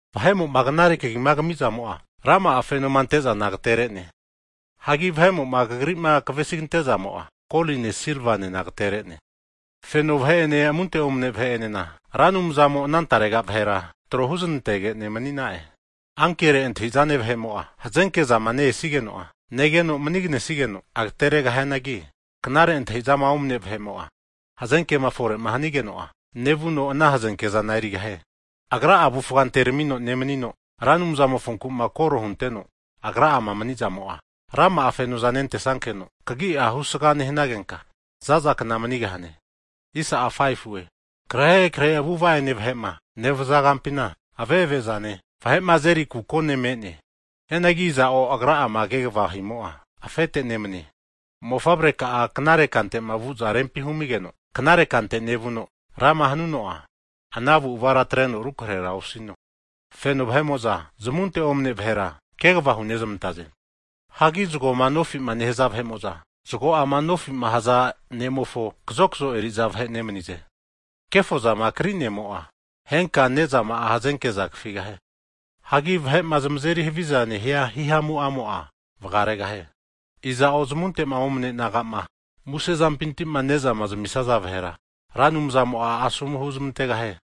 Vahe'mo'ma knare kagi'ma kami'zamo'a, rama'a fenoma ante'zana agatere'ne. Hagi vahe'mo'ma kagrima kavesigante zamo'a, koline silvanena agatere'ne. Feno vahe'ene amunte omane vahe'enena, Ra Anumzamo ana tarega vahera tro huzanantege'ne mani'na'e. Ankere antahizane vahe'mo'a, hazenke zama ne'esigeno negeno maniganesigeno agateregahianagi, knare antahizama omane vahe'mo'a, hazenkema fore'ma nehanigeno'a, negeno nevuno ana hazenkezana erigahie. Agra'a avufga anteramino nemanino, Ra Anumzamofonku'ma koro hunteno, agorga'ama mani'zamo'a, rama'a fenoza nentesankeno kagi'a husga nehanagenka, zaza kna manigahane. Akrahe krahe avu'ava ene vahe'ma nevaza kampina, ave'ave zane vahe'ma azeri kukone me'ne. Hianagi iza'o agra'ama kegvama himo'a afete nemanie. Mofavreka'a knare kantema vuza rempi humigeno knare kante nevuno, rama hanuno'a, ana avu'avara atreno rukrehe osino. Feno vahe'mo'za zmunte omne vahera, kegva hunezamantaze. Hagi zgoma nofi'ma nehaza vahe'moza, zago'ama nofima haza ne'mofo kazokazo eri'za vahe nemanize. Kefozama krinenimo'a, henka nezama'a hazenke'za kafigahie. Hagi vahe'ma zamazeri havizama nehia himamu'amo'a, vgaregahie. Iza'o zamunte'ma omane nagama muse zampintima ne'zama amisia vahera, Ra Anumzamo'a asomu huzamantegahie.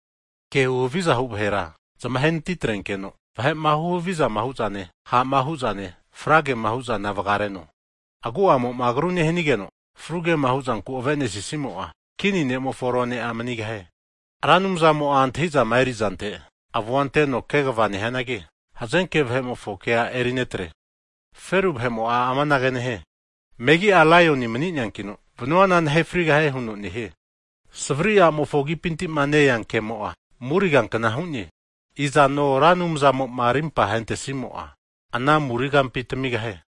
Kehu haviza hu vahera zamahe anati atrenkeno, vahe'ma huhavizama hu'zane, ha'ma hu'zane, fragema hu'zana vgareno. Agu'amo'ma agru nehanigeno, fru kema huzanku avenesisimo'a, kini ne'mofo rone'a manigahie. Ra Anumzamo'a antahizama erizante avu'a anteno kegva nehianagi, hazenke vahe'mofo kea erinetre. Feru vahe'mo'a amanage nehie, megi'a laioni mani'neankino, vanuana nahe frigahie huno nehie. Savri a'mofo agipintima nea kemo'a, muri kankna hu'ne, izano Ra Anumzamo'ma arimpa hentesimo'a, ana muri kampi tamigahie.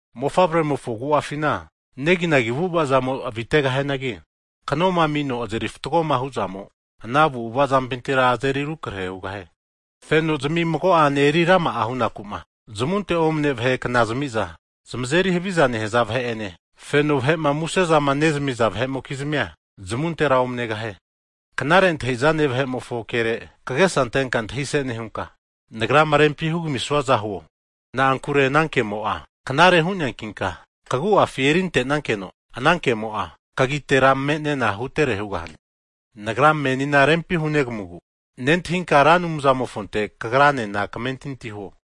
Mofavremofo agu'afina negi'nagi avu'avazamo avitegahianagi, kanoma amino azeri fatgoma hu'zamo ana avu'ava zampintira azeri arukrahe hugahie. Fenozami mago'ane eri rama'a hunaku'ma zamunte omane vahe kna zamiza zamazeri haviza nehaza vahe'ene, feno vahe'ma musezama nezamiza vahe'mokizmia, zamuntera omanegahie. Knare antahizane vahe'mofo kere kagesa antenka antahise nehunka, nagrama rempima hugamisuaza huo. Na'ankure ana kemo'a knare hu'neankinka kagu'afi erintenankeno ana kemo'a, kagitera me'nena kea hutere hugahane. Nagra menina rempi hunegamugu, nentahinka Ra Anumzamofonte kagranena kamentinti huo.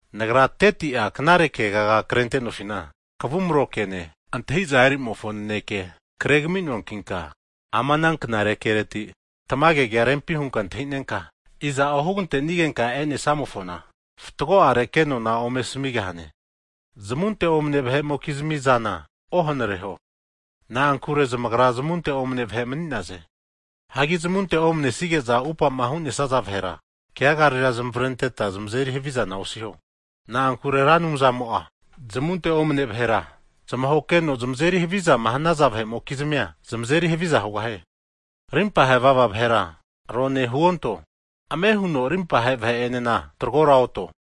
Nagra 30ti'a knare kegaga krentegantenofina, kavumro kene, antahiza eri zamofo naneke kregaminoankinka, ama ana kereti tamage kea rempi hunka antahinenka, iza'o hugantenigenka e'nesamofona fatgo'are kenona ome asamigahane. Zamunte omane vahe'mokizmi zana ohanareho, na'ankure zamagra zamunte omane vahe mani'naze. Hagi zamunte omanesige'zama upama hu'nesaza vahera, keagarera zamavrenteta zamazeri havizana osiho. Na'ankure Ra Anumzamo'a, zamunte omane vahera zamahokeno zamazeri havizama hanaza vahe'mokizmia, zamazeri haviza hugahie. Arimpa hevava vahera rone huonto, ame huno rimpahe vahe enena tagro oto,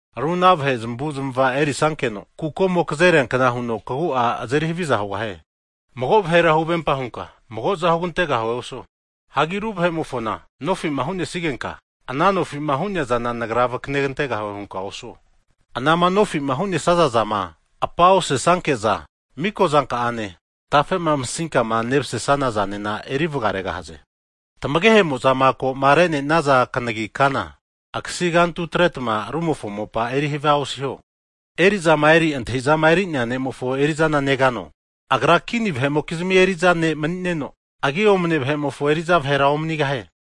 ru ana vahe zamavuzmava enerisankeno, kukomo kazeriankna huno kagu'a azeri haviza hugahane. Mago vahera huvempa hunka mago'za hugantegahue osuo. Hagi ru vahe'mo'ma nofima hu'nesigenka, ana nofima hu'nea zana nagra vakanentegahue hunka osuo. Anama nofima hu'nesaza zama apa osesanke'za miko zanka'ane, tafe'ma masinkama nemasesana zanena eri vgaregahaze. Tamagehe'mo'za ko'ma re'nenaza kanagi kana, akasi kantutretma rumofo mopa eri havia osiho. Eri'zama eri antahizama eri'nea ne'mofo erizana negano? Agra kini vahe'mokizmi eri'za vahe nemanino, agi omane vahe'mofo eri'za vahera omanigahie.